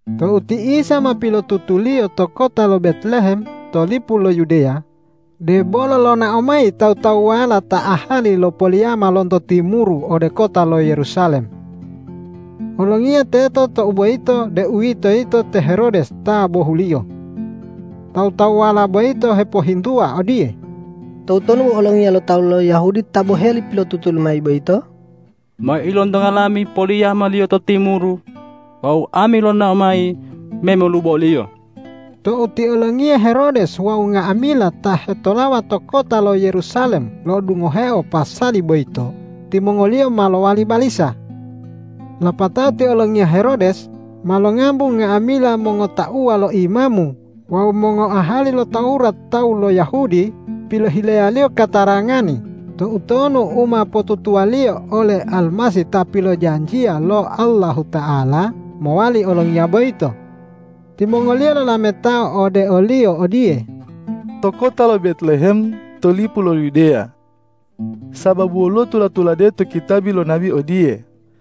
Tou ti Isa ma pilotutuliyo to kota lo Betlehem to lipu lo Yudeya, debolo lonao mayi tawu-tawuwala ta ahali lo poliyama lonto timuru ode kota lo Yerusalem. Olongiya teto tou boyito, deuwitoyito te Herodes ta bohuliyo. Tawu-tawuwala boyito hepohintuwa odiye,”Toutonu Olongiya lo tawu lo Yahudi ta boheli pilotutuliyo mayi boyito? Ma ilontonga lami poliyama-Liyo to timuru wawu ami lonao mayi me molubo o-Liyo.” Tou ti olongiya Herodes wawu nga'amila ta hetolawa to kota lo Yerusalem lo'odungoheo pasali boyito, timongoliyo ma lowali balisa. Lapatao ti olongiya Herodes ma longambu nga'amila mongotauwa lo imamu wawu mongoahali lo Tawurat tawu lo Yahudi pilohileyaliyo katarangani toutonu u ma potutuwaliyo ole Almasih ta pilojanjiya lo Allahuta'ala mowali olongiya boyito. Timongoliyo lolametao ode oliyo odiye,”To kota lo Betlehem to lipu lo Yudeya. Sababu woluwo tula-tulade to kitabi lo nabi odiye,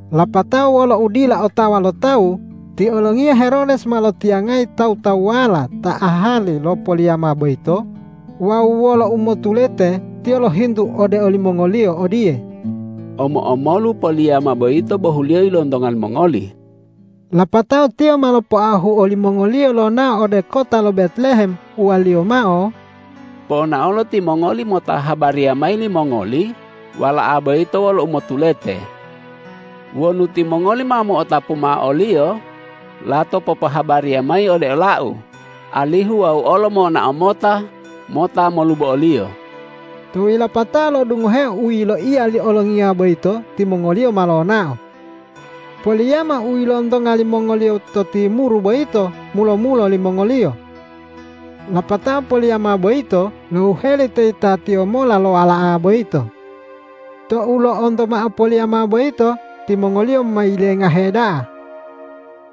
Lapatao wolo udila otawa lo tawu ti olongiya Herodes ma lotiyangayi tawu-tawuwala ta ahali lo poliyama boyito wawu wolo umotulete tiyo lohintu ode olimongoliyo odiye,”Omo-omolu poliyama boyito bohuliyo ilontonga limongoli?” Lapatao tiyo ma lopoahu olimongoliyo lonao ode kota lo Betlehem uwaliyo mao,”Ponaolo timongoli mota habariya mayi limongoli Wala'a boyito wolo umotulete. Wonu timongoli ma mo'otapu mao o-Liyo, lato popohabariya mayi ode olau, alihu wau olo monao mota, mota molubo o-Liyo.” Tou yilapato lo'odungoheo u yiloiya li olongiya boyito, timongoliyo ma lonao. Poliyama u ilontonga limongoliyo to timuru boyito mulo-mulo limongoliyo. Lapatao poliyama boyito lohuheli to yitatiyo mola lo Wala'a boyito. Tou lo'onto mao poliyama boyito, timongoliyo ma yilengahe da'a.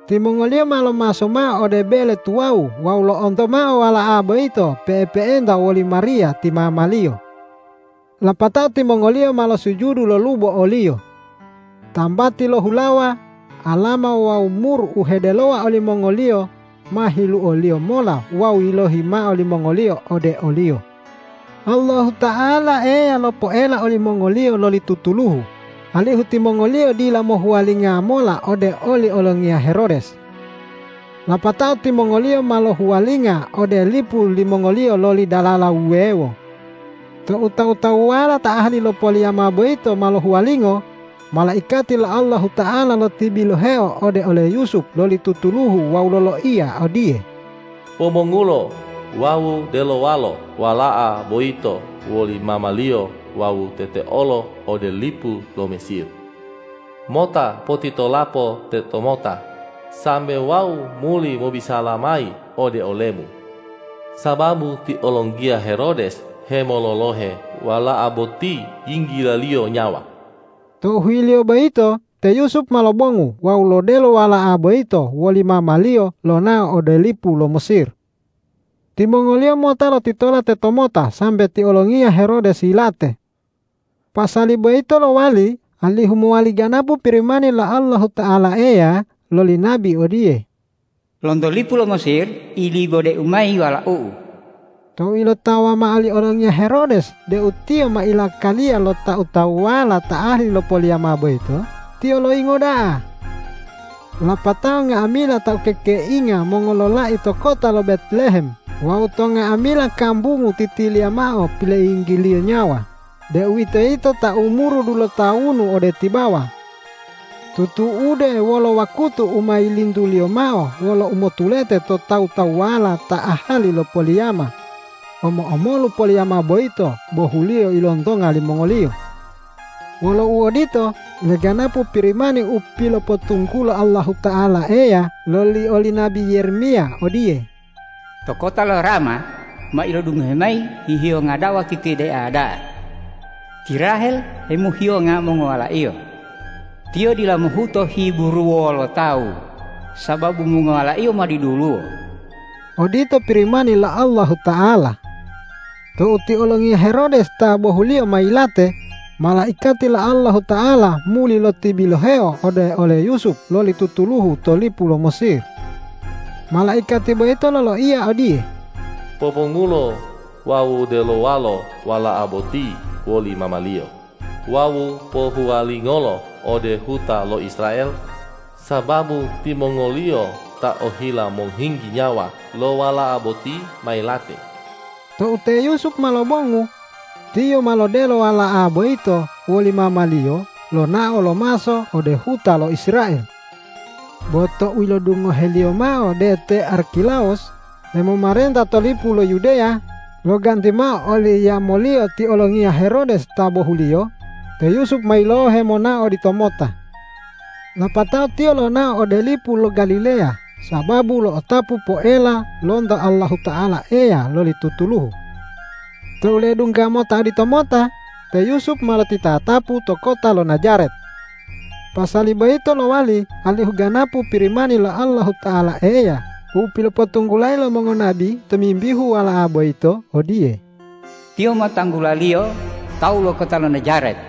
Timongoliyo ma lomaso mao ode bele tuwawu wawu lo'onto mao Wala'a boyito pe'epe'enta woli Mariya ti mama-Liyo. Lapatao timongoliyo ma losujudu lolubo o-Liyo. Tambati lo hulawa, alama wawu mur u hedelowa olimongoliyo ma hiluoliyo mola wawu yilohi mao limongoliyo ode o-Liyo. Allahuta'ala Eya lopoela olimongoliyo loli tutuluhu, alihu timongoliyo dila mohuwalinga mola ode oli olongiya Herodes. Lapatao timongoliyo ma lohuwalinga ode lipu limongoliyo loli dalala wuwewo. Tou tawu-tawuwala ta ahali lo poliyama boyito ma lohuwalingo, malaikati lo Allahuta'ala lotibiloheo ode ole Yusup loli tutuluhu wawu loloiya odiye,”Pobongulo wawu delowalo Wala'a boyito woli mama-Liyo wawu teteolo ode lipu lo Mesir. Mota potitolapo tetomota sambe wau muli mobisala mayi ode olemu, sababu ti olongiya Herodes hemololohe Wala'a boti yinggilaliyo nyawa.” Tou huyilo boyito te Yusup ma lobongu wawu lodelo Wala'a boyito woli mama-Liyo lonao ode lipu lo Mesir. Timongoliyo mota lotitola tetomota sambe ti olongiya Herodes yilate. Pasali boyito lowali alihu mowali ganapu Pirimani lo Allahuta'ala Eya loli nabi odiye,”Lonto lipu lo Mesir ilibode-U mayi Walau-U.” Tou ilotawa mao li olongiya Herodes deu tiyo ma ilakaliya lo tawu-tawuwala ta ahali lo poliyama boyito, tiyo loyingo da'a. Lapatao nga'amila ta ukekeinga mongololai to kota lo Betlehem wawu to nga'amila kambungu titiliya mao piloiyinggiliyo nyawa, deuwitoyito ta umuru dulotawunu ode tibawa. Tutu'ude wolo wakutu u ma yilintuliyo mao wolo umotulete to tawu-tawuwala ta ahali lo poliyama, omo-omolu poliyama boyito bohuliyo ilontonga limongoliyo. Wolo uodito, leganapu Pirimani u pilopotunggulo Allahuta'ala Eya loli oli nabi Yeremiya odiye, ”To kota lo Rama ma ilodungohe mayi hihiyonga da'a wawu titidea da'a. Ti Rahel hemohiyonga mongowalaiyo; tiyo dila mohuto hiburuwo lo tawu, sababu mongowalaiyo ma diduluwo.” Odito Pirimani lo Allahuata'ala. Tou ti olongiya Herodes ta bohuliyo ma yilate, malaikati lo Allahuta'ala muli lotibiloheo ode ole Yusup loli tutuluhu to lipu lo Mesir. Malaikati boyito loloiya odiye,”Pobongulo wawu delowalo Wala'a boti woli mama-Liyo wawu pohuwalingolo ode huta lo Israel, sababu timongoliyo ta ohila mohinggi nyawa lo Wala'a boti ma yilate.” Tou te Yusup ma lobongu, tiyo ma lodelo Wala'a boyito woli mama-Liyo lonao lomaso ode huta lo Israel. Bo tou ilodungoheliyo mao deu te Arkilawus hemomarenta to lipu lo Yudeya loganti mao oli yamoliyo ti olongiya Herodes ta bohuliyo, te Yusup ma yilohe monao oditomota. Lapatao tiyo lonao ode lipu lo Galileya sababu lo'otapu poela lonto Allahuta'ala Eya loli tutuluhu. Tou ledungga mota oditomota, te Yusup ma lotitatapu to kota lo Najaret. Pasali boyito lowali alihu ganapu Pirimani lo Allahuta'ala Eya u pilopotunggulayi lo mongonabi tomimbihu Wala'a boyito odiye,”Tiyo ma tanggulaliyo tawu lo kota lo Najaret.”